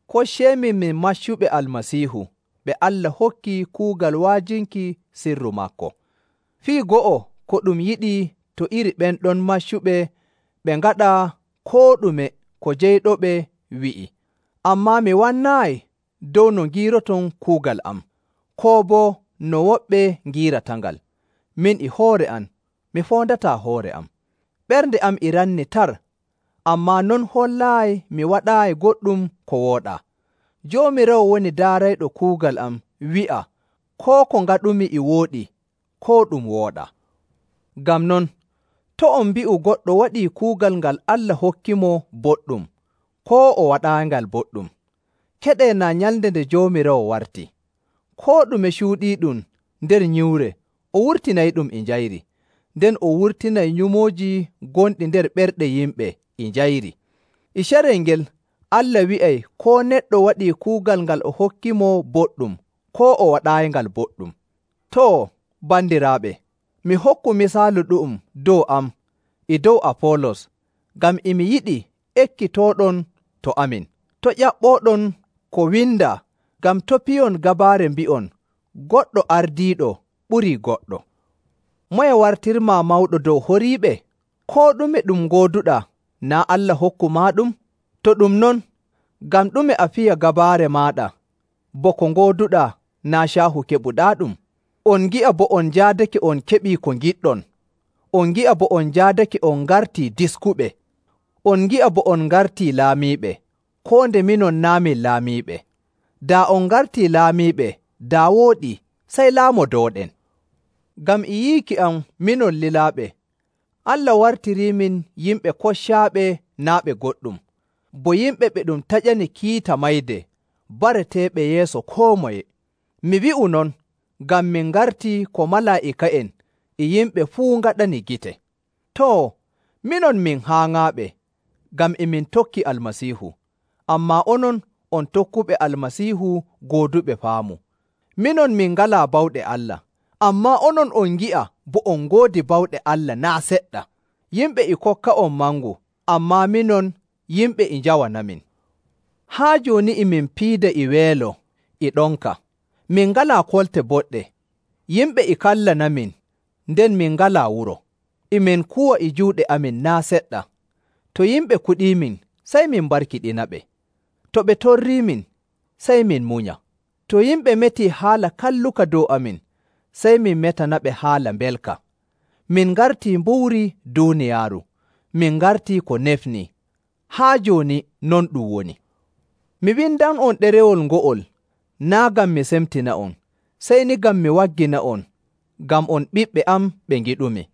Kocceemin min maccuɓe Almasiihu ɓe Allah hokki kuugal wa'ajinki sirru maako. Fii go'o ko ɗum yiɗi to iri ɓen ɗon maccuɓe ɓe ngaɗa koo ɗume ko jeyɗoɓe wi'i. Ammaa mi wannaayi dow no ngiiroton kuugal am, koo boo no woɓɓe ngiiratangal. Min e hoore am mi foondataa hoore am. Ɓernde am e ranni tar, ammaa non hollaayi mi waɗaayi goɗɗum ko wooɗaa. Joomiraawo woni daarayɗo kuugal am wi'a koo ko ngaɗumi e wooɗi koo ɗum wooɗaa. Ngam non, to' on mbi'u goɗɗo waɗii kuugal ngal Allah hokkimo boɗɗum, koo o waɗaayingal boɗɗum. Keɗee naa nyalnde nde Joomiraawo warti. Koo ɗume cuuɗiiɗum nder nyiwre o wurtinayɗum e njayri, nden o wurtinay nyumooji gonɗi nder ɓerɗe yimɓe e njayri. E carel ngel Allah wi'ay koo neɗɗo waɗii kuugal ngal o hokkimo boɗɗum koo waɗaayingal boɗɗum. Too, bandiraaɓe, mi hokku misaalu ɗu'um dow am e dow Afoolos ngam e mi yiɗi ekkitooɗon to amin: to' ƴaɓɓooɗon ko windaa, ngam to' piyon gabaare mbi'on goɗɗo ardiiɗo ɓurii goɗɗo. Moye wartirmaa mawɗo dow horiiɓe? Koo ɗume ɗum ngooduɗaa naa' Allah hokkumaaɗum? To ɗum non, ngam ɗume a fiya gabaare maaɗa bo ko ngooduɗaa naa' caahu keɓuɗaaɗum? On ngi'a bo on njaadake on keɓii ko ngiɗɗon! On ngi'a bo on njaadake on ngartii diskuɓe! On ngi'a bo on ngartii laamiiɓe, koo nde minon naa' min laamiiɓe. Daa on ngartii laamiiɓe daa wooɗii, sey laamodooɗen! Ngam e yiiki am minon lilaaɓe, Allah wartiriimin yimɓe koccaaɓe naa' ɓe goɗɗum, bo yimɓe ɓe ɗum taƴani kiita mayde bareteeɓe yeeso koo moye. Mi wi'u non ngam min ngartii ko malaa'ika'en e yimɓe fuu ngaɗani gite. Too, minon min haaŋaaɓe ngam e min tokki Almasiihu, ammaa onon on tokkuɓe Almasiihu gooduɓe faamu. Minon min ngalaa bawɗe Allah, ammaa onon on ngi'a bo on ngoodi bawɗe Allah naa' seɗɗa! Yimɓe e kokka'on mangu, ammaa minon yimɓe e njawanamin. Haa jooni e min piida e weelo e ɗonka. Min ngalaa kolte boɗɗe. Yimɓe e kallanamin, nden min ngalaa wuro. E min kuwa e juuɗe amin naa' seɗɗa. To yimɓe kuɗiimin, sey min mbarkiɗinaɓe. To ɓe torriimin, sey min munya. To yimɓe metii haala kalluka dow amin, sey min metanaɓe haala mbelka. Min ngartii mbuuri duuniyaaru, min ngartii ko nefnii. Haa jooni non ɗum woni. Mi windan'on ɗerewol ngo'ol naa' ngam mi semtina'on, sey ni ngam mi waggina'on ngam on ɓiɓɓe am ɓe ngiɗumi.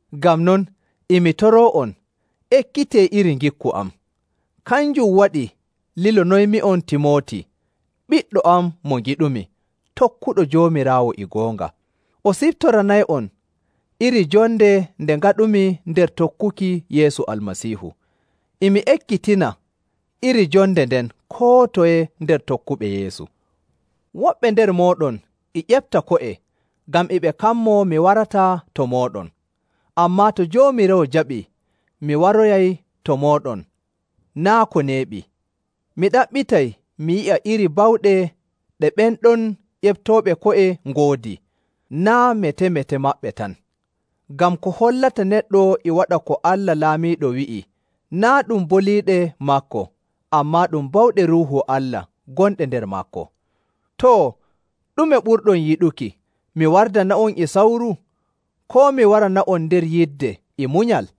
Ngam non, e mi toroo'on, ekkitee iri ngikku am. Kanjum waɗi lilonoymi'on Timooti, ɓiɗɗo am mo ngiɗumi, tokkuɗo Joomiraawo e goonga. O siftoranay'on iri jonde nde ngaɗumi nder tokkuki Yeesu Almasiihu. E mi ekkitina iri jonde nden koo toye nder tokkuɓe Yeesu. Woɓɓe nder mooɗon e ƴefta ko'e ngam e ɓe kammoo mi warataa to mooɗon. Ammaa to Joomiraawo jaɓii mi waroyay to mooɗon naa' ko neeɓi, mi ɗaɓɓitay mi yi'a iri bawɗe ɗe ɓen ɗon ƴeftooɓe ko'e ngoodi, naa' mete‑mete maɓɓe tan. Ngam ko hollata neɗɗo e waɗa ko Allah Laamiiɗo wi'i, naa' ɗum boliiɗe maako, ammaa ɗum bawɗe Ruuhu Allah gonɗe nder maako. Too, ɗume ɓurɗon yiɗuki? Mi wardana'on e sawru, koo mi warana'on nder yidde e munyal?